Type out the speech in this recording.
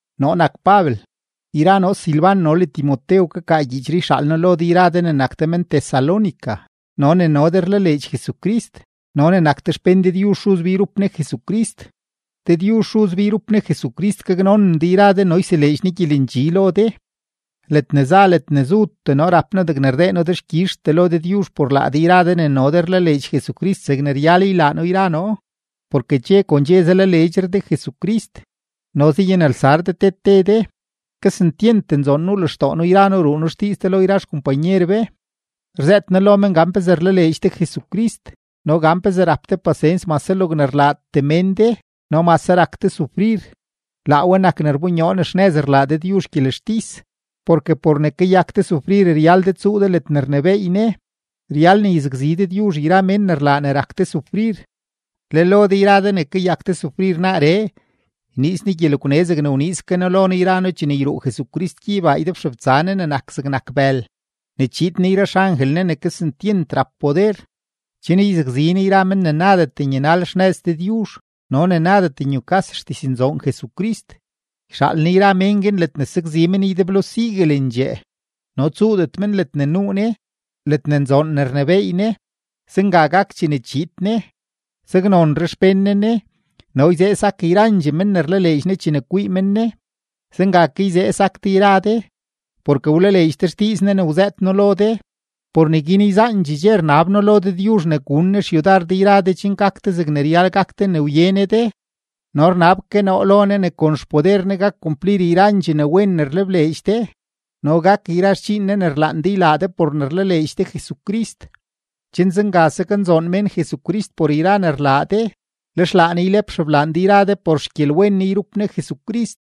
Noo nak Pabel, yra noo Silban no le Timotew kakaa gyiichree yxaal noo lo de yra de ne nak de men-Tesalónica no ne no de rlaleedx Jesucrist no ne nak de xpén Dëdyuzh Xuz be yrup Ne Jesucrist. Dëdyuzh Xuz be yrup Ne Jesucrist gaknonen de yra de no yseleedx Ne gyelendxi lo de. Ledne za ledne zutee noo rap noo degne rdee noo dexkyizhtee lo Dëdyuzh por laa de yra de ne no de rlaleedx Jesucrist zegne ryal ylaa noo yra noo, porke dxe kon dxe zalaleedxre de Jesucrist no zayanelsar de te te de. Kesentyent nzoon nuu lextoo noo yra noo ruu noo xdiiz de lo yra xkompanyer be, rzëët noo lo men gan pezee rlaleedx de Jesucrist no gan pezee rap de pasens mase logne rlaatee mén de no mase rak de sufrir. Laa we nak ne rbonyoo ne xnëz rlaa Dëdyuzh gyelextis, porke por ne kayak de sufrir ryal de tsuu de ledne rnebééy Ne. Ryal ne yzakzi Dëdyuzh yra mén ne rlaa ne rak de sufrir. Le lo de yra de ne kayak de sufrir naaree, yniiz Ne gyelegwne zegne yniiz ke No lo noo yra noo chene yruu Jesucrist gyeybaa ydebxebtsa Ne ne nak zegnak bël, ne chiid Ne yra xangel Ne ne kesentyent rap poder, chen yzakzi Ne yra men ne nadet nyanal xnëz Dëdyuzh no ne nadet nyukas xdiznzoon Jesucrist. Yxaal Ne yra mén guin ledne sakzi men ydeblo siguelendxee no tsuudet men ledne nuu Ne, ledne nzoon ne rnebééy Ne; zenga gak chene chiid Ne. Saknonre xpén Ne Ne no yzee sak yrandxee men ne rlaleedx Ne chene kwii men Ne. Zenga ke yzee sak de yra de, porke wlaleedx de xdiiz Ne ne wzëët noo lo de. Por neguin yzaandxee dxe rnab noo lo Dëdyuzh ne gun Ne xyudar de yra de chen gak de zegne ryal gak de ne wye Ne de; no rnab ke noo lo Ne ne kon xpoder Ne gak kumplir yrandxee ne wen ne rlebleedx de no gak yra xdxiin Ne ne rlaan de ylaa de por ne rlaleedx de Jesucrist, chen zenga saknzoon mén Jesucrist por yra ne rlaa de, lex laa Ne ylep xeblaan de yra de por xgyelwen Ne yrup Ne Jesucrist.